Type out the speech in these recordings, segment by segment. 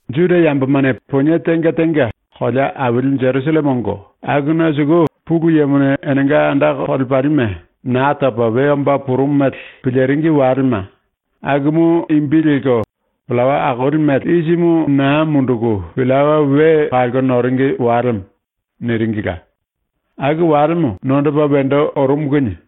⸤Juda yambomane ponie tenga tenga kolea aili Jerusalleme ongo akuna suku⸥ Pulu Yemone enenga anda kolepalime Naa Topa We Omba Purumu mele piliringi walema, akumu imbi lelko ‘Pillawa Akoli Mele Isimu Naa Munduku Pillawa We Kalko Noringi Walemo’ niringila, aku walemo nondopa wendo orumu kinie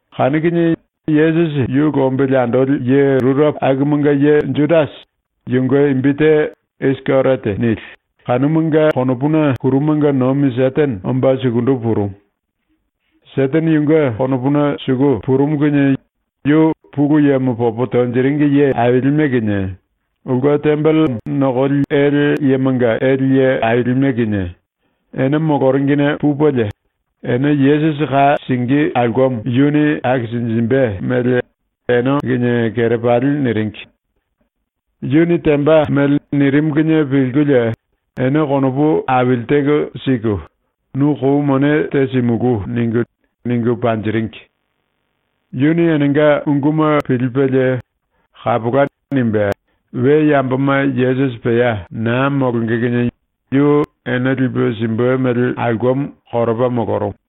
Kanu kinie Yesusi yu lombili andoli ye rurepo akumanga ye Judasi, yunge imbi te ‘Isikeriote’ nili, kanumunge konopuna ⸤kurumanga nomi⸥ Setene omba sukundu purumu. ⸤Setene yunge konopuna suku purumu⸥ kinie yu Pulu Yemo popo tonjiringi ye ailime kinie, ulke tembele nokoli ele yemanga ele ye ailime kinie, ene moloringine pupelie, ene Yesusi ka singí aulkemo yuni akisinjimbe mele ene kinie kerepali niringi. Yuni temba mele nirimu kinie pilkulie ene konopu aili teko siku “Nu kou mone te simulú.” ningu, ningu panjiringi. Yuni enenga unguma pilipelie “Kapola.” nimbe, we yamboma Yesusi pea naa molonge kinie yu ene lipe simbe mele aulkemo koropa molorumu.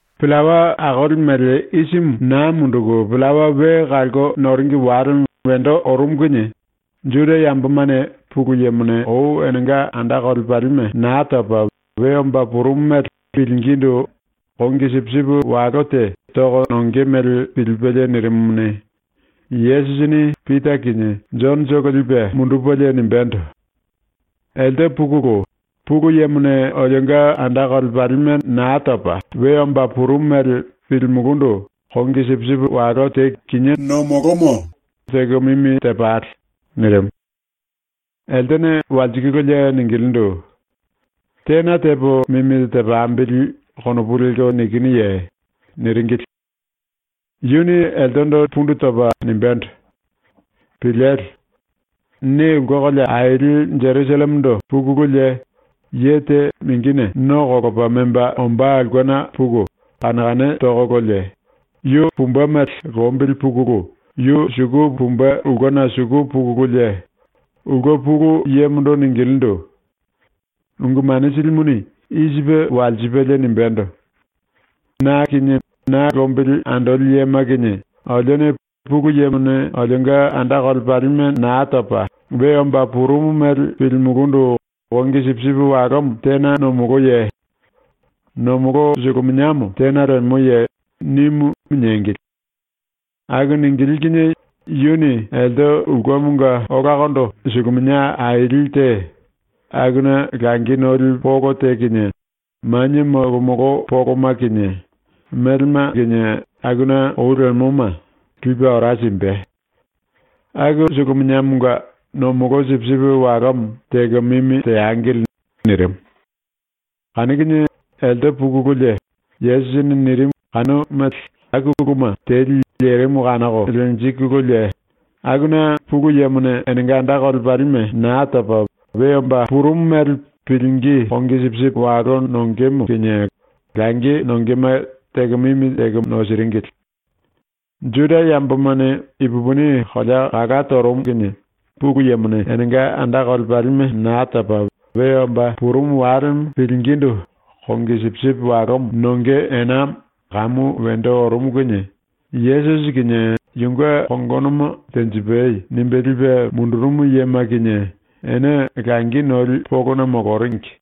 Pillawa Akoli Mele Isimu Naa Munduku Pillawa We Kalko Noringi Walemo wendo orumu kinie Juda yambomane Pulu Yemone ou enenga anda kolepalime Naa Topa We Omba Purumu mele pilingindu kongi sipisipi walo te toko nonge mele pilipelie nirimumuni, Yesusini Pita kinie Jonotolo lipe mundupelie nimbendo: “Elte pukulu, Pulu Yemone olionga anda kolepalime Naa Topa We Omba Purumu mele pilimulúndu kongi sipisipi walo te kinié nomolomo teko mimi tepale.” nirimu. Eltene walsikululie ningilindu: “Tena tepo mimi tepambili konopu lelko nikinuye?” niringili. Yuni eltendo pundu topa nimbendo: “Piliele. Ne ulke kolea aili ⸤Jerusallemendo⸥ pukululie, ye te mingine no kolopa memba ombá aulkena puku kane kane tokololie, yu pumbe mele lombili pukulu yu suku pumbe ulkena suku pukululie ulke pulu yemondo ningilindu: “Ungu Mane Silimuni i sipe walsipelie nimbendo: “Na kinie na lombili andoli yema kinie olione Pulu Yemone olionga anda kolepalime Naa Topa We Omba Purumu mele pilimulundu kongi sipisipi walomo tena nomoloye? Nomolo suluminiamo tena lemoye?” nimu.” niengili. Aku ningilí kinie yuni elte ulkemonga olakondo suluminia aili te, akuna langi noli polo te kinie, manie molomolo poloma kinie, melema kinie akuna ou lemoma, lipe ora simbe. Aku suluminiamonga ⸤nomolo sipisipi walomo⸥ teko mimi teangili.” nirimu. Kanu kinie elte pukululie, Yesusini nirimu kanu mele aku uluma teli lerimu kanoko lenjikululie, akuna Pulu Yemone enenga anda kolepalime Naa Topa We Omba Purumu mele pilingí kongi sipisipi walo nongemo kinie langi nongema teko mimi teko nosiringili. Juda yambomane ipupini kolea kalá torumu kinie Pulu Yemone enenga anda kolepalime Naa Topa We Omba Purumu Walemo pilingindu kongi sipisipi walomo nonge enamo kamu wendo orumu kinie, Yesusi kinie yunge kongonomo ‘tenjipai.’ nimbe lipe mundurumu yema kinie ene langi noli polona moloringi.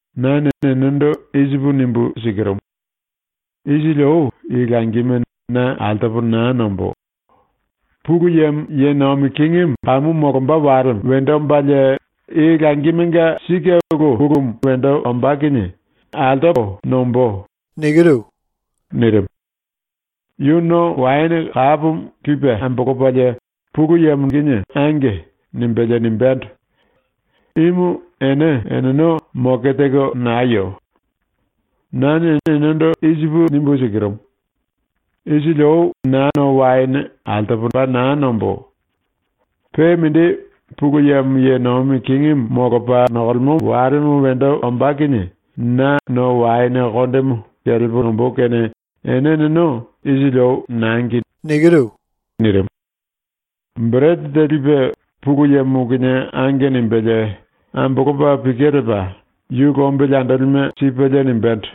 Nane enendo i sipu nimbu sikirumu: Isili ou i langime na altopo naa nombó. Pulu Yemo ye nomi kingimu kamu molomba walemo wendo ombalie i langimenga sike ulu pulumu wendo ombá kinie altopo nombó.” nirimu. Yu no waene kapomo lipe ambolopalie Pulu Yemondo “Ange.” nimbelie nimbendo: “Imu ene eneno moke teko nayo. Nane enendo i sipu nimbu sikirumu: Isili ou na no waene altopo paa naa nombó. Pe mindi, Pulu Yemo ye nomi kingimu molopa nokolemo walemo wendo ombá kinie na no waene kondemo kelepo nombó kene ⸤ene eneno isili ou nangi⸥.” nirimu. Berete te lipe Pulu Yemo kinie “Ange.” nimbelie ambolopa pike lepa ⸤yu lombili andolime⸥ sipelie nimbendo: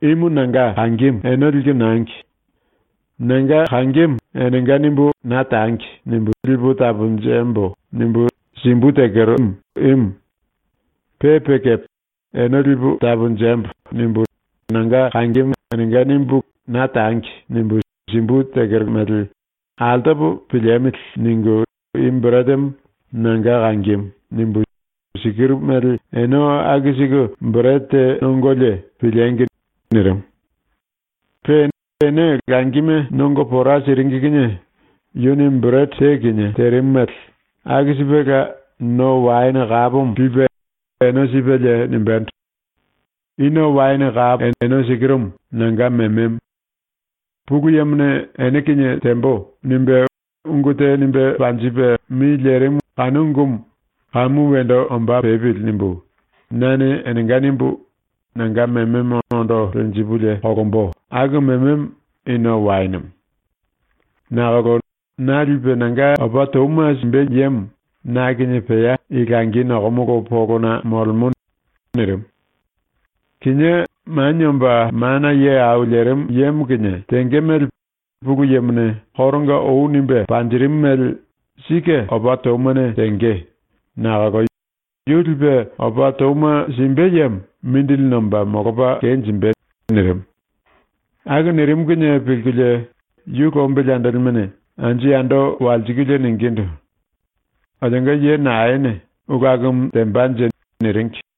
“Imu nanga kangimu ⸤ene liku nangi⸥. ‘Nanga kangimu ‘enenga’ nimbu ⸤lipu taponjembo.’ nimbu tangi⸥ simbu tekero imu. Pe pe kepe, ‘Ene lipu taponjembo.’ nimbu nanga kangimu enenga nimbu ‘Na tangi.’ nimbu simbu tekero mele ‘Altopo piliemili.’ ningu i beretemo “Nanga kangimu.” nimbu sikiru mele ene aku siku berete te nongolie piliengi!” nirimu. Pe ene langime nongo pora siringi kinie yuni ⸤berete te kinie terimu mele⸥ aku sipela no waene kapomo lipe ⸤ene sipelie⸥ nimbendo: “I ⸤no waene⸥ kapo ⸤ene sikirumu⸥ nanga mememo. ⸤Pulu Yemone ‘Ene kinie tembo.’ nimbe,⸥ ungu te nimbe panjipe mi lerimu kanu ungumu ‘Kamu wendo omba pepili.’ nimbu nane enenga nimbu nanga mememo ondo lenjipulie ⸤kolombo⸥ aku mememo i no waenemo. “Nakolo na lipe nanga opa touma simbe yemo na kinie pea i langi nokomolo polona molemo.” nirimu. “Kinié Manie Omba Mana Ye Au Lerimu Yemo kinie tenge mele Pulu Yemone koronga ou nimbe panjirimu mele sike opa toumane tenge, nakolo yu lipe opa touma simbe yemo mindili nomba molopa kenjimbe.” nirimu. Aku nirimu kinie pilkulie ⸤yu lombili andolimene⸥ anju yando walsikulie ningindu: “Olionga ye naene ulu akumu tembanje?” niringi.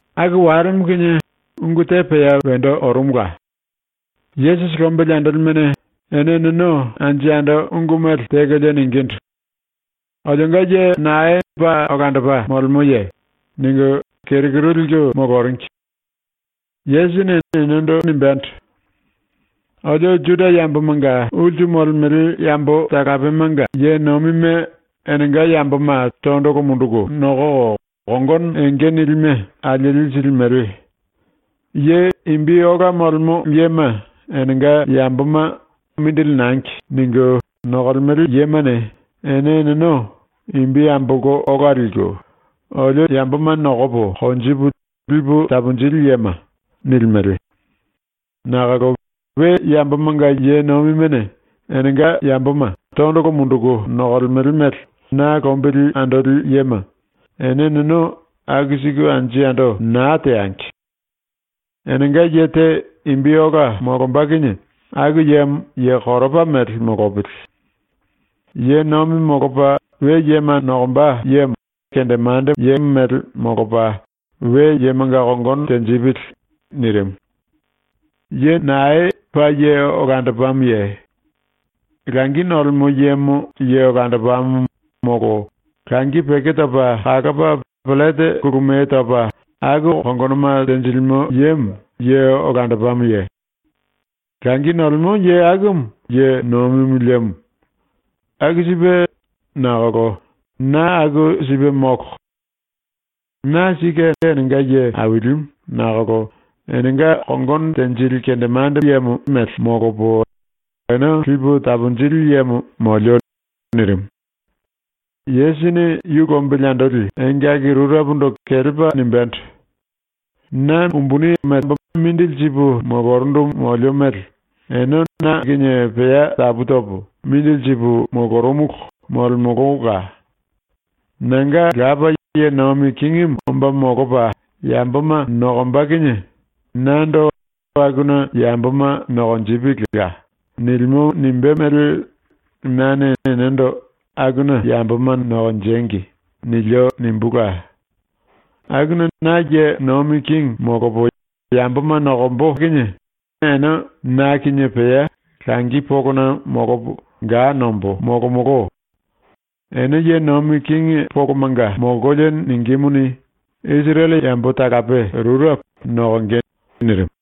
Aku walemo kinie ungu te pea wendo orumula. ⸤Yesusi lombili andolimene⸥ ene eneno anju yando ungu mele tekolie ningindu: “Olionga ye nae paa olandopa molemoye?” ningu keru kuru liku moloringi. Yesusini enendo nimbendo: “Olio Juda yambomanga ulsu molemele yambo talapemanga ye nomime enenga yamboma tondolo munduku nokoko kongono enge nilime alieli silimele. Ye imbi ola molemo yema enenga yamboma ‘Mindili nangi.’ ningu nokolemele yemane ene eneno imbi ambolko ola liku, “Olio yamboma nokopo konjipu lipu taponjili yema.” nilimele. Nakolo ⸤we yambomanga ye nomimene enenga yamboma tondolo munduku nokolemele mele na lombili andoli yema⸥ ene eneno aku siku anju yando naa teangi. Enenga ye te imbi ola molomba kinie aku yemo ye koropa mele molopili. Ye nomi molopa we yema nokomba yemo ye kendemandemo mele molopa we yemanga kongono tenjipili.” ⸤nirimu⸥. “Ye nae paa ye olandopamoye? Langi nolemo yemo ye olandopamo molo langi peko topa kalopa pellete kulumiye topa aku kongonoma tenjilimo yemo ye olandopamoye? Langi nolemo ye akumu ye nomimu lemo. Aku sipe, nakolo na aku sipe molo. Na ⸤sike enenga ye ailimu⸥ nakolo enenga kongono tenjili kendemande mele molopo ene lipu taponjili yemo molio.” ⸤nirimu.⸥ ⸤Yesusini yu lombili andoli engaki rurepondo kelepa nimbendo:⸥ “Na mindili sipu molorundu molio mele ene na kinie pea tapu topo mindili sipu molorumulu molemolola. Nanga Lapa ye nomi kingimu omba molopa yamboma nokomba kinie nando ‘Akuna yamboma nokonjipilila.’ nilimo nimbé mele nane enendo ‘Akuna yamboma nokonjengi.’ nilio nimbula. Akuna na ye nomi kingi molopo yamboma nokombo kinie ene na kinie pea langi polona molopo ga nombo molomolo. Ene ye nomi kingi polomanga molkolie ningímuni, Isirele yambo talape rurepo nokonge.” ⸤nirimu.⸥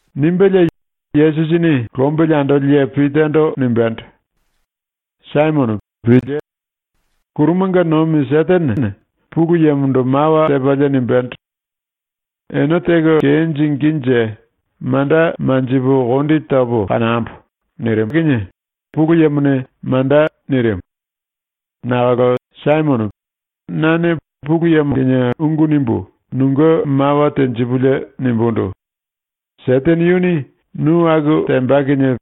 ⸤Nimbelie, Yesusini lombili andoli ye Pitando nimbendo:⸥ “Saimono, pílie! ⸤Kurumanga nomi⸥ Setenene Pulu Yemondo mawa tepalie nimbendo: “Ene teko kenjingínje manda manjipu kondi topo kanambo.” nirimu kinie Pulu Yemone “Manda.” nirimu. Nakolo Saimono, nane Pulu Yemo kinie ungu nimbu nunge mawa tenjipulie nimbundu: “Setene yuni nu aku temba kinie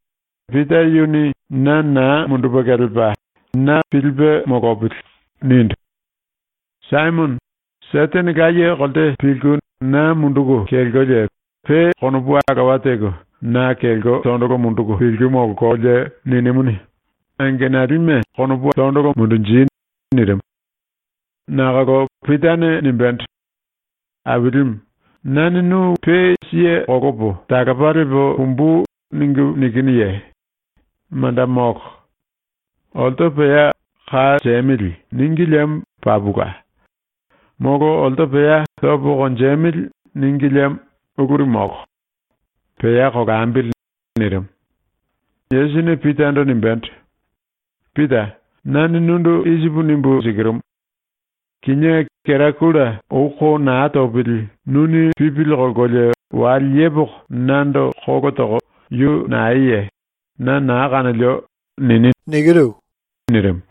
Pita yuni na naa mundupe kelepa na pilipe molopili.” nindu. Saimono, Setene laye kolte pilku na munduku kelkolie, pe konopu alowa teko na kelko tondolo munduku pilku molkolie ninimuni, angenalime tondolo mundunji.” nirimu. Nakolo Pitane nimbendo: “Ailimu, nane nu pe siye kolopo talopa lepo pumbu ningu nikinuye? Manda molo. Olto pea “Ka siemili.” níngi liemo papula. Molo olto pea “Topo konjemili.” níngi liemo uluri molo. Pea kolambili.” nirimu. Yesusini Pitando nimbendo: “Pita, nane nundu i sipu nimbu sikirumu: Kinié kera gulta ou ko naa topili nuni pipili kolkolie wale yepoko nando kolo toko “Yu naeye? Na naa kanolio.” nini.” nirimu.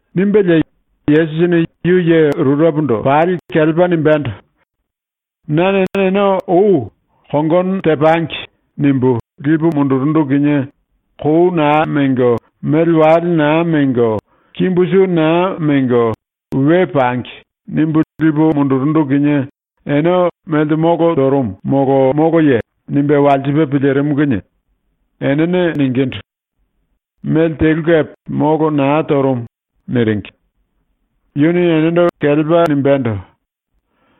Nimbelie Yesusini yu ye ⸤rurepondo⸥ pali kelepa nimbendo: “Nane ene ou ⸤‘Kongono tepangi.’ nimbu⸥ lipu mundurundu kinie ‘Kou naa mengo, mele wale naa mengo, kimbu su naa mengo, we pangi.’ nimbu lipu mundurundu kinie ene melte molo torumu molo moloye?” nimbe walsipe pilirimu kinie enene “Mele telu kepe molo naa torumu.” niringi. Yuni enendo kelepa nimbendo: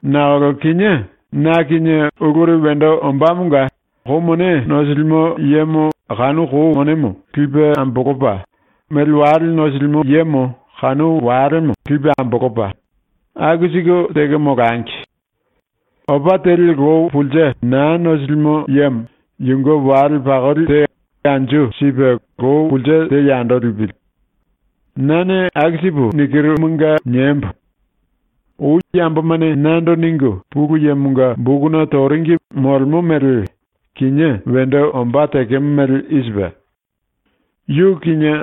“Nakolo kinié na kinie uluri wendo ombámonga, kou mone nosilimo yemo kanu kou monemo lipe ambolopa, mele wale nosilimo yemo kanu walemo lipe ambolopa, aku siku teko molangi. Opa teli lou pulse naa nosilimo yemo yunge wale pakoli te anju sipe lou pulse te yando lipili. ⸤Nane aku sipu nambemuna nikiru, niembo.⸥ Ou yambomane nando ningu Pulu Yemonga bokuna toringi molemo mele kinié wendo ombá tekemo mele i sipe: “Yu kinie,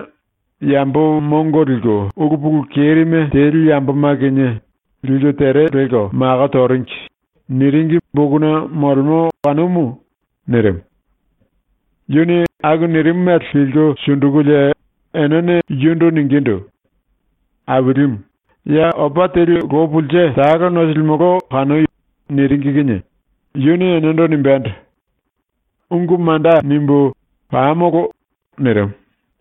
yambo mongo liku ulu pulu kerime teli yamboma kinie, liku tere lelko mako toringi.” niringi bokuna molemo kanumu.” nirimu. Yuni aku nirimu mele pilku sundukulie enene yundu ningindu: “Ailimu, ya opa teli lou pulse talo nosilimolo kanoi.” niringi kinie yuni enendo nimbendo: “Ungu manda nimbu, ⸤pamolo.⸥” nirimu.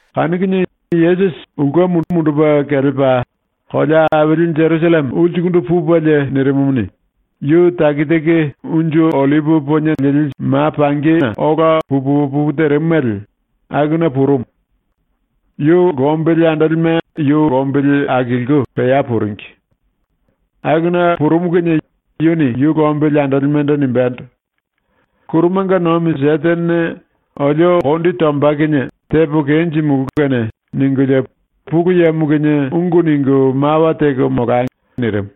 Kanu kinie Yesusi ⸤ulke mundupe kelepa kolea aili Jerusalleme⸥ ulsukundu pupelie nirimumuni, yu taki taki ma pangi Unju Ollipi Poniena ola pu pu opu terimu mele akuna purumu. Yu lombili andolime yu lombili akilku pea puringi. Akuna purumu kinie yuni yu lombili andolimendo nimbendo: “⸤Kurumanga nomi⸥ Setenene ‘Olio kondi tomba kinie tepo kenjimulú kene’ ningulie Pulu Yemo kinie ungu ningu mawa teko molai.” nirimu.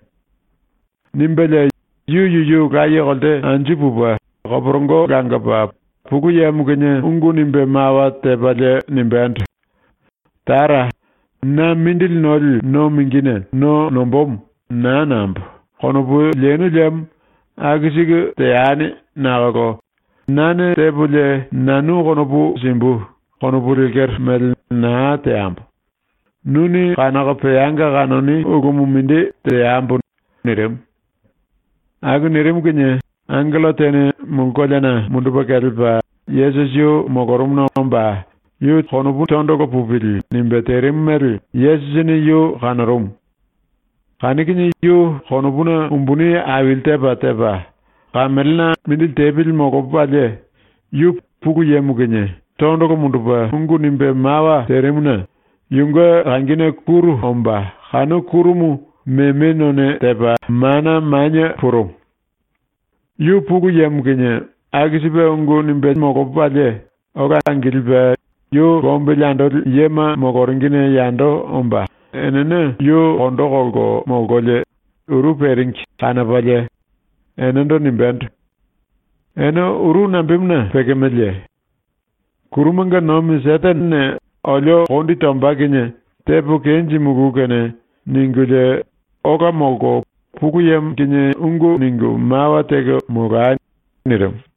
Nimbelie yu yuyu laye kolte anju pupe koporongo langopa, Pulu Yemo kinie ungu nimbe mawa tepalie nimbendo: “Tara, na mindili noli no mingine no nombómo ‘Naa nambo.’ konopu lenu liemo aku siku teani nakolo ‘Nane tepolie nanu konopu simbu.’ konopu lekero mele naa teambo. Nuni kanoko peanga kanoni ulumu mindi teambo.” nirimu. Aku nirimu kinie angello tene mulu koleana mundupe kelepa Yesusi yu molorumuna omba ‘Yu tondolo pupili.’ nimbe terimu mele Yesusini yu kanorumu. Kanu kinie yu konopuna umbuni aili tepa tepa, kamelena mindili tepili molopalie yu Pulu Yemo kinie tondolo mundupe ungu nimbe mawa terimuna yunge kangine kúru omba kanu kúrumu meme none tepa mana manie purumu. Yu Pulu Yemo kinie aku sipe ungu nimbelie ola angilipe yu lombili andoli yema moloringine yando omba enene yu kondo kolko molkolie uru peringi kanopalie enendo nimbendo: “Ene uru nambemuna pekemeleye? ‘⸤Kurumanga nomi Setenene⸥ olio kondi tomba kinie tepo kenjimulú kene’ ningulie ola molko Pulu Yemo kinie ungu ningu mawa teko molai.” nirimu.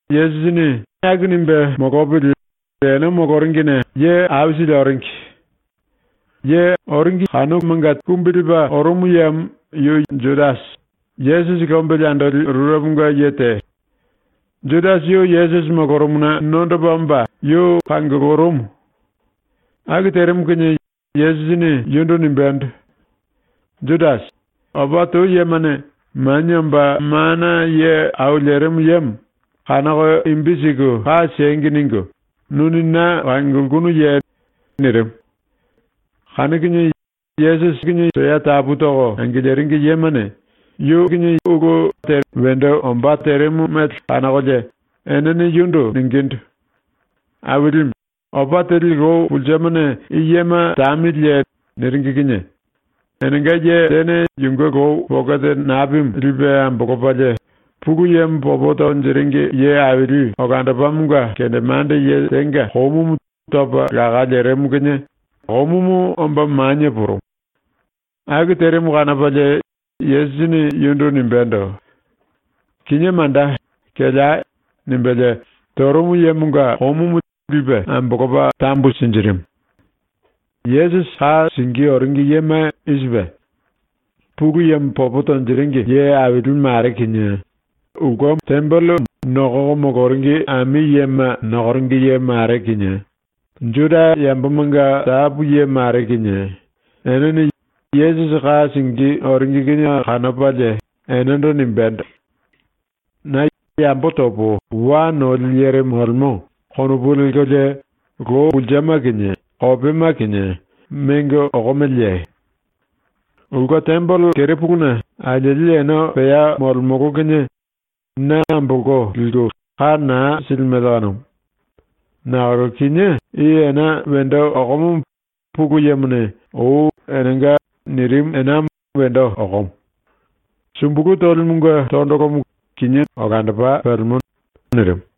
Yesusini aku nimbe molopili ene moloringine ye aisili oringi. Oringi yemanga te kumbi lepa orumu yemo yu ye Judasi, Yesusi lombili andoli rureponga ye te. Judasi yu Yesusi molorumuna nondopa omba yu kangulurumu. Aku terimu kinie Yesusini yundu nimbendo: “Judasi, opa tou yemane Manie Omba Mana Ye Au Lerimu Yemo ‘kanoko imbi siku ka siengi.’ ningu nuni na kangulkunuye?” nirimu. Kanu kinie Yesusi pea tapu toko angiliringi yemane yu ulu temba terimu mele kanokolie enene yundu ningindu: “Ailimu, opa teli lou pulsemane i yema tamiliye?” niringi kinie enenga ye tene ⸤yunge lou pokete napimu lipe ambolopalie⸥ Pulu Yemo popo tonjiringi ye aili olandopamonga kendemande ye tenga komumu topa laká lerimu kinie komumu omba manie purumu. Aku terimu kanopalie Yesusini yundu nimbendo: “Kinié manda, kelei!” nimbelie torumu yemonga komumu lipe ambolopa tambu sinjirimu. Yesusi ka singí oringi yema i sipe: Pulu Yemo popo tonjiringi ye aili mare kinie, tembele ulkemo nokoko moloringi ami yema nokoringi ye mare kinie, Juda yambomanga tapu ye mare kinie, enene Yesusi ka singí oringi kinie kanopalie enendo nimbendo: “Na ‘yambo topo wa noli yere molemo.’ konopu lelkolie lou pulsema kinie kopema kinie mengo okomeleye? Ulke tembele kerepuluna alieli ene pea molemolo kinie na ambolko liku ka naa silimele kanumu. Nakolo kinié i ena wendo okomomo Pulu Yemone ou ‘Enenga.’ nirimu enamo wendo okomo. Sumbulu tolimunge tondolomo kinie olandopa pelemo.” nirimu.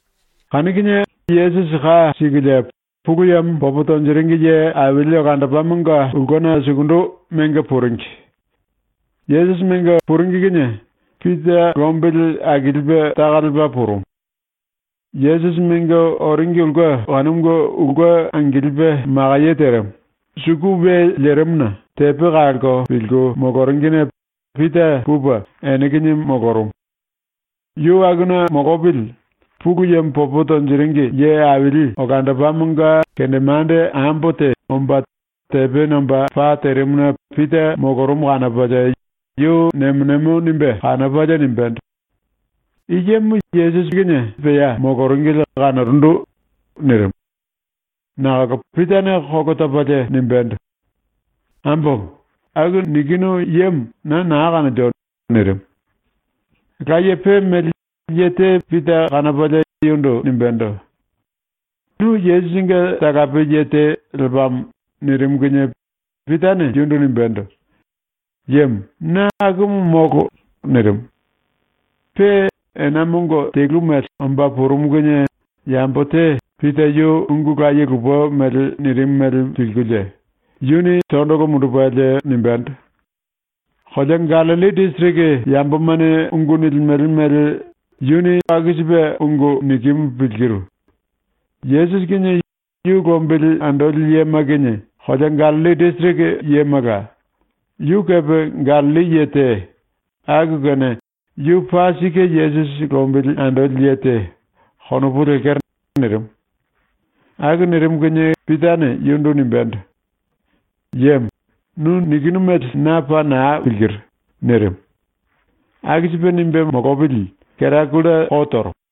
Kanu kinie enene Yesusi ka sikulie Pulu Yemo popo tonjiringi ye aili olandopamonga ulkena sukundu mengo puringi. Yesusi mengo puringi kinie Pita lombili akilipe taka lepa purumu. Yesusi mengo oringi ulke kanumunge ulke angilipe makaye terimu, suku we lerimuna tepe kalko pilku moloringine Pita pupe ene kinie molorumu. Yu akuna molopili ⸤Pulu Yemo popo tonjiringi ye aili olandopamonga⸥ kendemande ambo te omba tepe nomba pa terimuna Pita molorumu kanopalie yu nemo nemo nimbe kanopalie nimbendo: “I yemo Yesusi pea moloringili kanorundu.” nirimu. Nakolo Pitane kolo topalie nimbendo: “Ambomo, aku nikinu yemo na naa kanolio.” nirimu. Laye pe mele ye te Pita kanopalie yundu nimbendo: “Nu Yesusinge talape ye te lepamo.” nirimu kinie Pitane yundu nimbendo: “Yemo, na akumu molo.” nirimu. Pe ena mongo telu mele omba purumu kinie yambo te ⸤Pita yu ungu laye lupe mele nirimu mele pilkulie⸥ yuni tondolo mundupelie nimbendo: “Kolea Gallilli disiriki yambomane ungu nilimele mele yu aku sipe ungu nikimu pilkiru. ⸤Yesusi kinie yu lombili andoli yema kinie kolea Gallilli disiriki yemala,⸥ yu kepe Gallilli ye te, aku kene ‘Yu paa sike Yesusi lombili andoli ye te.’ konopu lekero.” nirimu. Aku nirimu kinie Pitane yundu nimbendo: “Yemo, nu nikinu mele na paa naa pilkiru.” nirimu. Aku sipe nimbe molopili kera gulta ko torumu.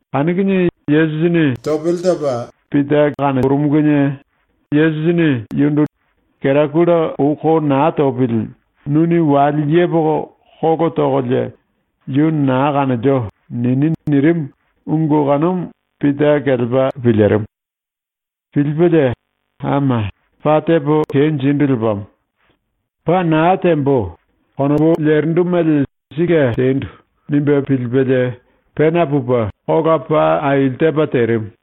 Kanu kinie Yesusini topele topa Pita kanorumu kinie Yesusini yundu “Kera gulta ou ko naa topili nuni wale yepoko kolo tokolie “Yu naa kanolio.” nini.” nirimu ungu kanumu Pita kelepa pilirimu. Pilipelie ⸤‘Ama, paa tepo kenjindu lepamo. ‘Paa naa tembo.’ konopu lerindu mele sike tendu.’ nimbe pilipelie⸥ pena pupe kola paa aili tepa terimu.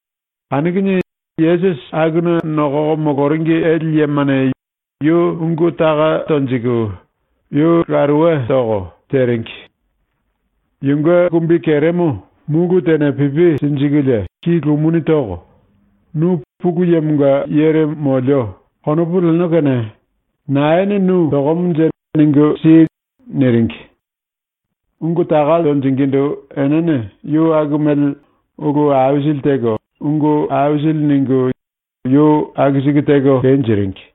Kanu kinie Yesusi akuna nokoko moloringi ele yemane yu ungu taka tonjiku, yu laruwe toko, teringi. Yunge kumbikeremo múlu tene pipi sinjikulie ki lumuni toko ⸤“Nu ‘Pulu Yemonga yere molio.’ konopu leno kene⸥ naene nu tokomonje ningu si.” niringi. Ungu taka tonjingindu enene yu aku mele ulu aisili teko ungu aisili ningu yu aku siku teko kenjiringi.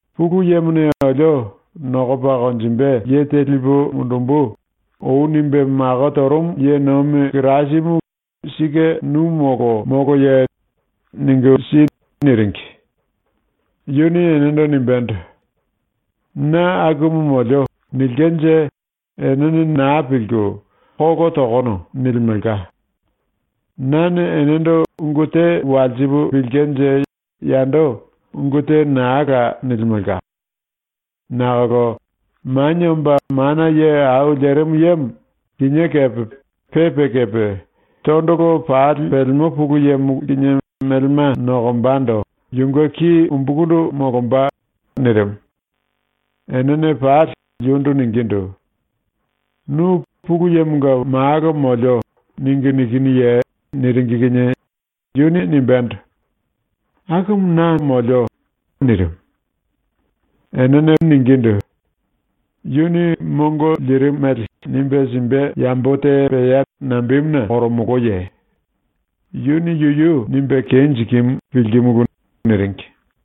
“Pulu Yemone olio “Nokopa konjimbe ye te lipu mundumbu.” ou nimbe mako torumu ye nomi Kirasimu sike nu molo moloye? Ningu si.” niringi. Yuni enendo nimbendo: “ “Na akumu molio.” nilkenje enene naa pilku “Kolo tokono.” nilimelka. Nane enendo ungu te walsipu pilkenje yando ungu te naa la nilimelka. Nakolo Manie Omba Mana Ye Au Lerimu Yemo kinié kepe pe pe kepe tondolo pali pelemo Pulu Yemo ⸤kinie melema nokombando⸥ yunge ki umbukundu molomba.” nirimu. Enene pali yundu ningindu: “Nu “Pulu Yemonga Malo molio.” ningu nikinuye?” niringi kinie yuni nimbendo: “Akumu na.” nirimu. Enene ningindu: “Yuni mongo lirimu mele nimbe simbe yambo te pea nambemuna koromoloye? Yuni yuyu nimbe kenjikimu pilkimulu.” niringi.